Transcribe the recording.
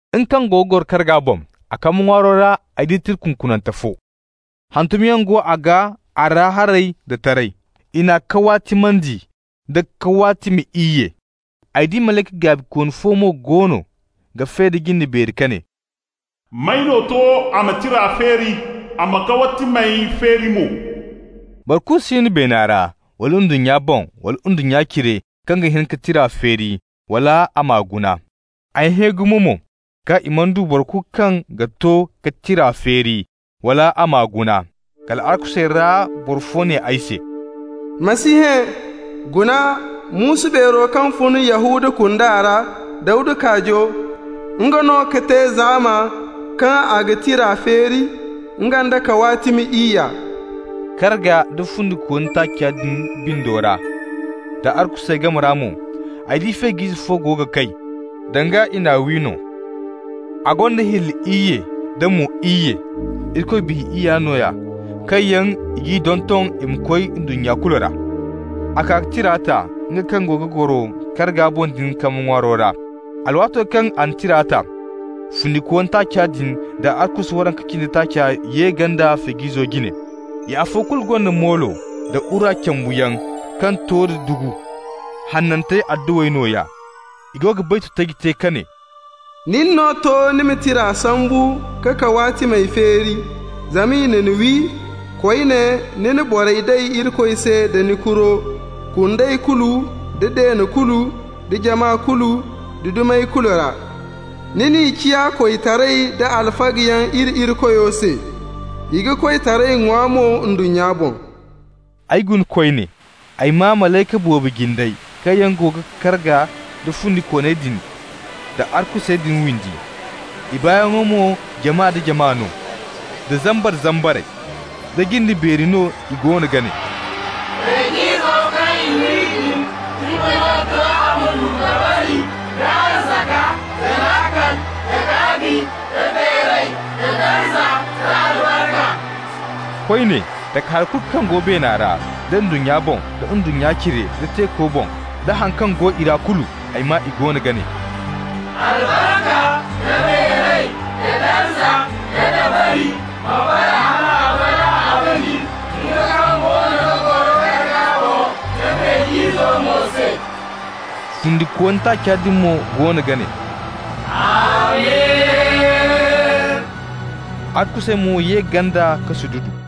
Nga kaŋ go ga goro karga boŋ, a kambe ŋwaaro ra ay di tira kunkunante fo. Hantumyaŋ go a gaa a ra haray da taray. I n'a kawaatimandi nda kawaatimi iyye. Ay di malayka gaabikooni fo mo goono ga fe da jinde beeri ka ne: «May no to a ma tira feeri, a m'a kawaatimey feeri mo?» Boro kulu si no beena ra, wala ndunnya boŋ, wala ndunnya cire, kaŋ ga hin ka tira feeri, wala a m'a guna. Ay hẽ gumo mo kaŋ i mana du boro kulu kaŋ ga to ka tira feeri, wala a m'a guna. Kal arkusey ra boro fo ne ay se: «Ma si hẽ! Guna, muusu beero kaŋ fun Yahuda kunda ra, Dawda kaajo, nga no ka te zaama kaŋ a ga tira feeri, nga nd'a kawaatimi iyya.» Karga nda fundikooni taaca din bindo ra, da arkusey game ra mo, ay di Feej'ize fo go ga kay, danga i n'a wi no. A gonda hilli iyye da mo iyye -- Irikoy Biya iyya nooya kaŋ yaŋ i g'i donton i ma koy ndunnya kulu ra. A kaa ka tira ta nga kaŋ go ga goro karga boŋ din kambe ŋwaaro ra. Alwaato kaŋ a na tira ta, fundikooni taaca din da arkusu waranka cindi taaca ye ganda Feej'izo jine. I afo kulu gonda moolo da wura cambuyaŋ kaŋ to da dugu. Hanantey adduwey nooya. I go ga baytu taji te ka ne: «Nin no to ni ma tira sambu k'a kawaatimey feeri. Zama i na ni wi, koyne, ni na borey day Irikoy se da ni kuro, kundey kulu, da deene kulu, da jama kulu, da dumey kulu ra. Ni n'i ciya koytaray da alfagayaŋ iri Irikoyo se. I ga koytaray ŋwa mo ndunnya boŋ.» Ay guna koyne. Ay maa malayka boobo jindey kaŋ yaŋ go ga karga nda fundikooney din da arkusey din windi. I baayaŋo mo jama nda jama no, da zambar-zambarey. Da jinde beeri no i goono ga ne: «Feej'izo kaŋ i wi din, nga no to a ma du dabari, da arzaka, da laakal, da gaabi, nda beeray, da darza, da albarka!» Koyne, takahari kulu kaŋ go beena ra, da ndunnya boŋ, da ndunnya cire, da teeko boŋ da haŋ kaŋ go i ra kulu, ay maa i goono ga ne: «Albarka, da beeray, da darza, da dabari ma bara hal abada abadin, nga kaŋ goono ga goro karga boŋ, da Feej'izo mo se!» Fundikooni taaca din mo goono ga ne: «Amin!» Arkusey mo ye ganda ka sududu.